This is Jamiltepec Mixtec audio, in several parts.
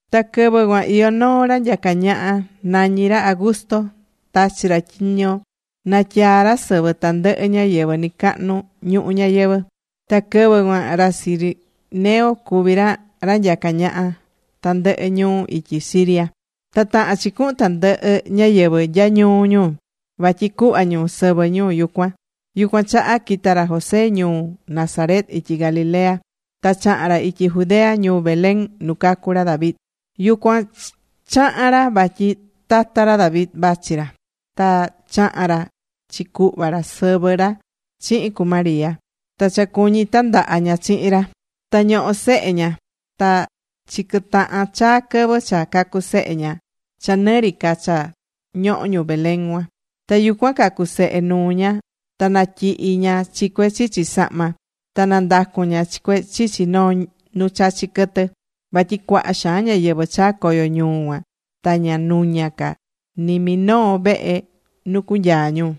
Ta quɨvɨ cuan iyó noo ra nyacá ñaha, nañí ra Augusto. Tachi̱ ra tyiño natyaa ra sɨvɨ tandɨhɨ ñáyɨvɨ nɨcahnu ñuhu ñayɨvɨ̱. Ta quɨvɨ cuan ra Cirenio cuví ra ra nyacá ñaha tandɨhɨ ñuu ityi Siria. Ta tahán chi cuhun tandɨhɨ ñáyɨvɨ nya ñuu ñu. Vatyi cuhva ñu sɨvɨ ñu yucuan. Yucuan chaha quita̱ ra José ñuu Nazaret ityi Galilea. Ta chaha̱n ra ityi Judea ñuu Belén nu cacu̱ ra David. Yucuan chaha̱n ra vatyi tata ra David vachi ra. Ta chaha̱n ra chi cuhva ra sɨvɨ ra chihin cu María. Ta cha cuñí tandaha ña chihin ra. Ta ñohó sehe ña. Ta chiquɨtaha̱n chaa quɨvɨ cha cacu sehe ña cha nɨ ri ca cha ñohó ñu Belén cuan. Ta yucuan cacu̱ sehe nuu ña. Ta natyihi̱ ña chi cue chichi sahma. Ta nandacu̱n ña chi cue chichi noo nu chachí quɨtɨ. Vatyi cuaha xaan ñáyɨvɨ chaa̱ coyo ñuu cuan. Ta ña nuña ca ni minoo vehe nu cunyaa ñu.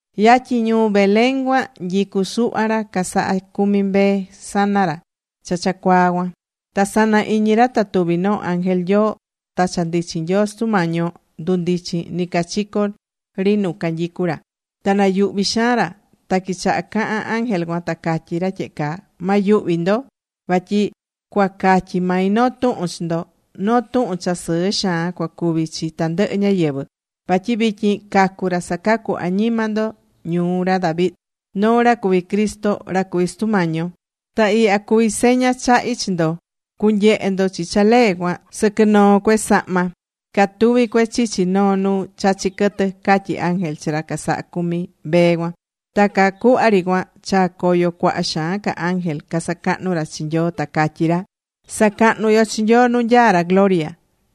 Yatyin ñuu Belén cuan nyicú suhva ra casahá cumi mbee sana ra cha cha cuaa cuan. Ta sana iñi ra ta tuvi̱ noo ángel Nyoo. Ta cha ndichin Nyoo Sutu Mañi yo ndundichi̱n nɨcachico ri nu canyicú ra. Ta nayuhví xaan ra. Ta quichaha cahán ángel cuan, ta catyí ra tyehe caa: ―Ma yuhvi ndo. Vatyi cuacatyi mai noo tuhun chi ndo. Noo tuhun cha sɨɨ xaan cuacuvi chi tandɨhɨ ñáyɨvɨ. Vatyi vityin cacu̱ ra sacacú añima ndo ñuu ra David. Noo ra cuví Cristo, ra cuví Sutu Mañi yo. Ta ihya cuví seña chahi chi ndo, cunyehe ndo chi cha lee cuan, sɨquɨ noo cue sahma. Catuví cue chichi noo nu chachí quɨtɨ ―catyí ángel chi ra casahá cumi mbee cuan. Ta caa cuhva ri cuan chaa̱ coyo cuaha xaan ca ángel casacahnú ra chi Nyoo, ta cacatyí ra: Sa̱cahnu yo chi Nyoo nu nyaá ra gloria.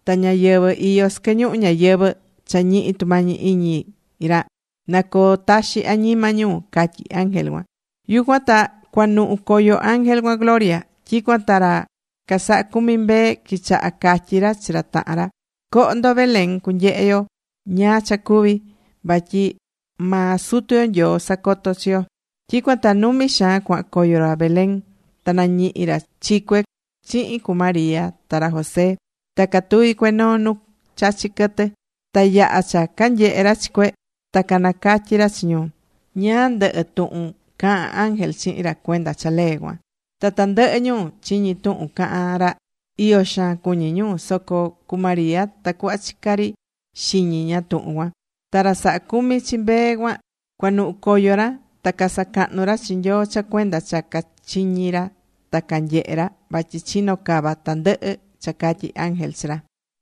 Ta ñáyɨvɨ iyó sɨquɨ ñuhu ñayɨvɨ̱ cha ñihi tumañi iñi ra, na coo taxi añima ñu, catyí angel cuan. Yucuan ta cuanuhu̱ coyo ángel cuan gloria. Tyicuan ta ra casahá cumi mbee quichaha̱ catyi ra chi ra tahan ra: ―Co̱ho ndo Belén. Cunyehe yo ñáá cha cuvi̱. Vatyi maa Sutu yo Nyoo sacoto̱ chi yo. Tyicuan ta numi xaan cuahan coyo ra Belén. Ta nañihi̱ ra chi cue chihin cu María ta ra José. Ta catuví cue noo nu chachí quɨtɨ. Ta yaha̱ cha canyehe ra chi cue, ta canacatyi̱ ra chi ñu ñáá ndɨhɨ tuhun caha̱n ángel chihin ra cuenda cha lee cuan. Ta tandɨhɨ ñu chiñi̱ tuhun cahán ra, iyo xaan cuñí ñu. Soco cu María ta cuhva chicá ri xiñi ña tuhun cuan. Ta ra sahá cumi chi mbee cuan cuanuhu̱ coyo ra. Ta casacahnú ra chi Nyoo cha cuenda cha cachiñi̱ ra ta canyehe̱ ra. Vatyi chino̱ cava tandɨhɨ cha catyi̱ ángel chi ra.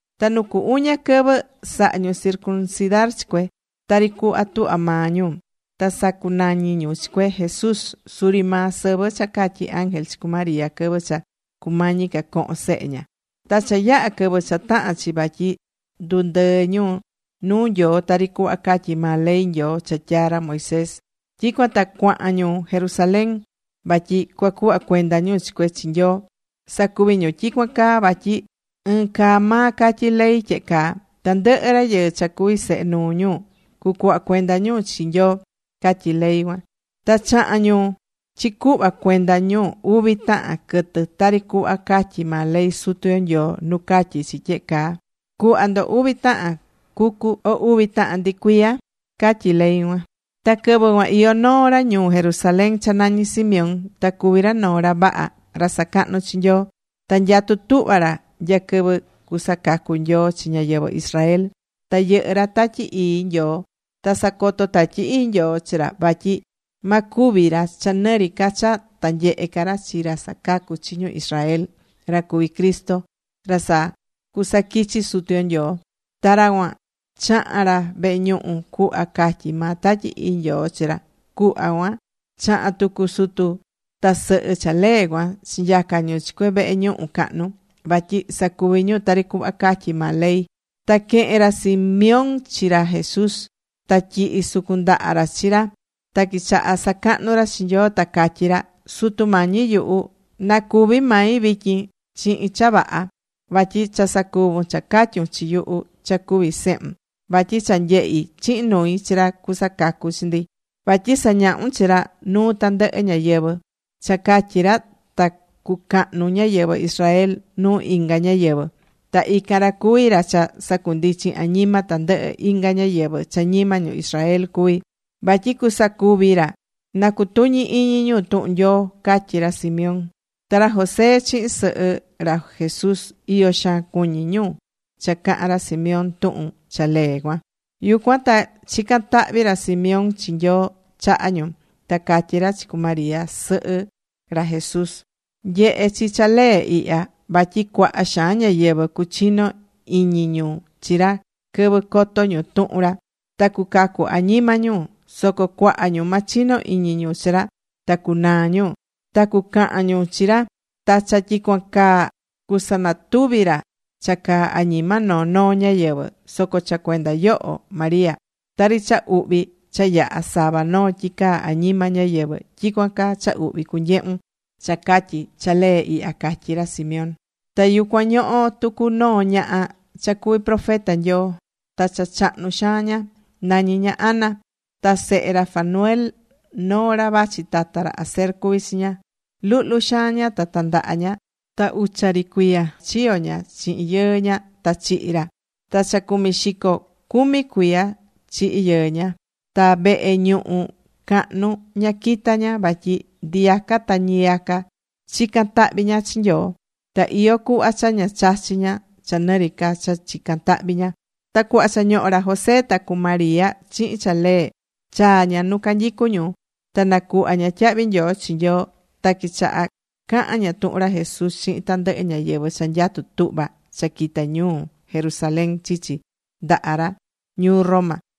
Ta nu cu uña quɨvɨ, saha̱ ñu circuncidar chi cue, tari cuhva tuhva maa ñu. Ta sacunañi̱ ñu chi cue, Jesús. Suri maa sɨvɨ cha catyi̱ ángel chi cu María quɨvɨ cha cumañi ca cohon sehe ña. Ta cha yaha̱ quɨvɨ cha taha̱n chi vatyi ndundɨɨ ñu nuu Nyoo, tari cuhva catyí maa ley Nyoo cha tyaa̱ ra Moisés, tyicuan ta cuahan ñu Jerusalén. Vatyi cuacuhva cuenda ñu chi cue chi Nyoo. Sacuvi̱ ñu tyicuan caa vatyi ɨɨn caa maa catyí ley tyehe caa: “Tandɨhɨ rayɨɨ cha cuví sehe nuu ñu, cucuhva cuenda ñu chi Nyoo”, catyí ley cuan. Ta chaha̱n ñu chicuhva cuenda ñu uvi tahan quɨtɨ tari cuhva catyí maa ley Sutu yo Nyoo nu catyí chi tyehe caa: “Cu̱hva ndo uvi tahan cucu o uvi tahan ndicuiya”, catyí ley cuan. Ta quɨvɨ cuan iyó noo ra ñuu Jerusalén cha nañí Simeón. Ta cuví ra noo ra vaha, ra sacahnú chi Nyoo. Ta nyatú tuhva ra nya quɨvɨ cusacacu Nyoo chi ñáyɨvɨ Israel. Ta yɨhɨ́ ra Tatyi Ii Nyoo. Ta sacoto̱ Tatyi Ii Nyoo chi ra vatyi ma cúvi ra cha nɨ ri ca cha ta nyehe ca ra chi ra sacacú chi ñu Israel, ra cuví Cristo, ra cha cusaquichi Sutu yo Nyoo. Ta ra cuan chaha̱n ra vehe ñuhu cuhva catyi̱ maa Tatyi Ii Nyoo chi ra. Cuhva cuan chaha̱n tucu sutu ta sɨhɨ cha lee cuan chinyaca̱ ñu chi cue vehe ñuhu cahnu, vatyi sacuvi ñu tari cuhva catyí maa ley. Ta quehe̱n ra Simeón chi ra Jesús. Ta tyihi̱ sucun ndaha ra chi ra. Ta quichaha̱ sacahnu ra chi Nyoo. Ta catyí ra: ―Sutu Mañi yuhu. Na cúvi mai vityin chihin cha vaha. Vatyi cha sacuvu̱n cha catyu̱n chi yuhu cha cuví sehun. Vatyi cha nyehi̱ chihin nui chi ra cusacacu chi ndi. Vatyi sañahu̱n chi ra nuu tandɨhɨ ñáyɨvɨ. Cha catyi ra ta cucahnu ñáyɨvɨ Israel nuu inga ñáyɨvɨ. Ta ican ra cuví ra cha sacundichín añima tandɨhɨ inga ñáyɨvɨ cha ñima ñu Israel cuví. Vatyi cusacuvi ra na cutuñi iñi ñu tuhun Nyoo ―catyí ra Simeón. Ta ra José chihin sɨhɨ ra Jesús, iyo xaan cuñi̱ ñu cha caha̱n ra Simeón tuhun cha lee cuan. Yucuan ta chica̱n tahvi ra Simeón chi Nyoo chaha ñu. Ta catyí ra chi cu María sɨhɨ ra Jesús: ―Nye̱he chi cha lee ihya. Vatyi cuaha xaan ñáyɨvɨ cuchino iñi ñu chi ra quɨvɨ coto ñu tuhun ra, ta cucacu añima ñu. Soco cuaha ñu ma chino iñi ñu chi ra, ta cunaa ñu. Ta cucahan ñu chi ra. Ta cha tyicuan caa cusanatuvi ra cha caa añima noo noo ñáyɨvɨ. Soco cha cuenda yoho, María. tari cha uhvi cha yahá sava noo tyicaa añima ñáyɨvɨ, tyicuan caa cha uhvi cunyehún cha catyi cha lee ihya ―catyí ra Simeón. Ta yucuan ñohó tucu noo ñaha cha cuví profeta Nyoo. Ta cha chahnu xaan ña. Nañí ña Ana. Ta sehe ra Fanuel noo ra vachi tata ra Aser cuví chi ña. Luhlu xaan ña ta tandaha ña, ta ucha ri cuiya chiyo̱ ña chihin yɨɨ ña ta chihi̱ ri ra. Ta cha cumi xico cumi cuiya chihi̱ yɨɨ ña. Ta vehe ñuhu cahnu ña quitá ña, vatyi ndiyaca ta ñiyaca chicán tahvi ña chi Nyoo. Ta iyó cuhva cha ña chachi̱ ña cha nɨ ri ca cha chicán tahvi ña. Ta cuhva cha ñohó ra José ta cu María chihin cha lee, chaa̱ ña nu canyicú ñu. Ta nacuhva̱ ña tyahvi nyoo chi Nyoo. Ta quichaha̱ cahan ña tuhun ra Jesús chihin tandɨhɨ ñáyɨvɨ cha nyatú tuhva cha quita ñuu Jerusalén chichi ndaha ra ñuu Roma.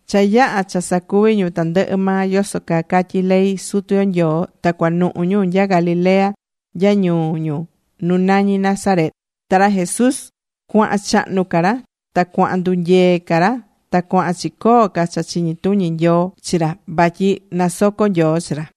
Cha yaha̱ cha sacuvi ñu tandɨhɨ maa yoso caa catyí ley Sutu yo Nyoo, ta cuanuhu ñu nya Galilea nya ñuu ñu nu nañí Nazaret. Ta ra Jesús cuahan chahnu ca ra. Ta cuahan ndunyee ca ra ta cuahan chicoo ca cha chiñi tuñi Nyoo. Vatyi nasoco Nyoo chi ra.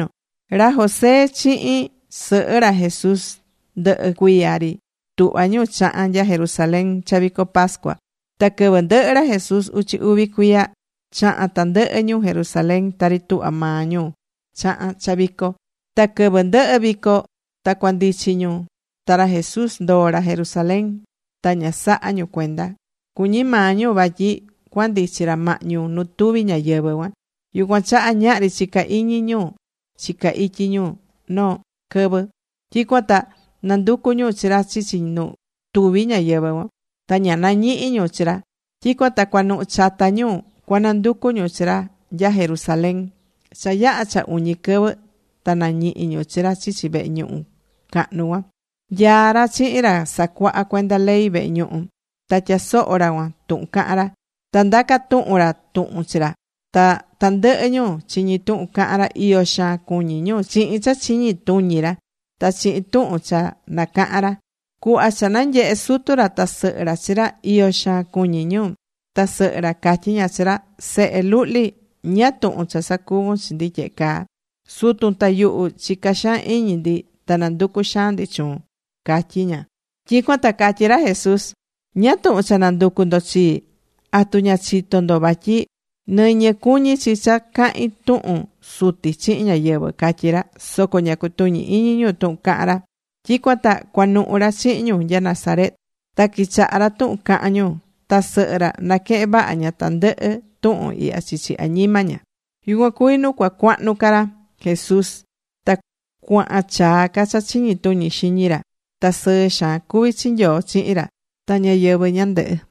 Ra José chihin sɨhɨ ra Jesús ndɨhɨ cuiya ri tuhva ñu chahán nya Jerusalén cha vico pascua. Ta quɨvɨ ndɨhɨ̱ ra Jesús uchi uvi cuiya, chaha̱n tandɨhɨ ñu Jerusalén tari tuhvá maa ñu chahán cha vico. Ta quɨvɨ ndɨhɨ̱ vico ta cuandichi ñu, ta ra Jesús ndoo̱ ra Jerusalén. Ta ña saha̱ ñu cuenda. Cuñí maa ñu vatyi cuandichi ra mahñu nu tuvi ñáyɨvɨ cuan. Yucuan chaha ñahri chicá iñi ñu chicá ityi ñu noo quɨvɨ. Tyicuan ta nanducu̱ ñu chi ra chichi nu tuvi ñáyɨvɨ cuan, ta ña nañihi̱ ñu chi ra. Tyicuan ta cuanuhu chata ñu cuananducu ñu chi ra nya Jerusalén. Cha yaha̱ cha uñi quɨvɨ ta nañihi̱ ñu chi ra chichi vehe ñuhu cahnu cuan. Nyaá ra chihin ra sacuahá cuenda ley vehe ñuhu. Ta tyasohó ra cuan tuhun cahán ra. Ta ndacá tuhun ra tuhun chi ra. Ta tandɨhɨ ñu chiñí tuhun cahán ra, iyo xaan cuñí ñu chihin cha chiñi tuñi ra, ta chihin tuhun cha nacahán ra. Cuhva cha nanyehe̱ sutu ra ta sɨhɨ ra chi ra, iyo xaan cuñí ñu. Ta sɨhɨ ra catyí ña chi ra: ―Sehe luhli. ¿Ñáá tuhun cha sacuvu̱n chi ndi tyehe caa? Sutun ta yuhu chica̱ xaan iñi ndi ta nanducu̱ xaan ndi chuun ―catyí ña. Tyicuan ta catyí ra Jesús: ―¿Ñáá tuhun cha nanducu ndo chii? ¿Atu ña chito̱ ndo vatyi nɨñɨ cuñí chi cha cahin tuhun Suti chihin ñáyɨvɨ? ―catyí ra. Soco ña cutuñí iñi ñu tuhun caha̱n ra. Tyicuan ta cuanuhu̱ ra chihin ñu nya Nazaret. Ta quichahá ra tuhun cahán ñu. Ta sɨhɨ ra naquehen vaha ña tandɨhɨ tuhun ihya chichi añima ña. Yucuan cuví nu cuacuahnu ca ra Jesús. Ta cuahan chaa ca cha chiñi tuñi xiñi ra. Ta sɨɨ xaan cuví chi Nyoo chihin ra ta ñáyɨvɨ ñandɨhɨ.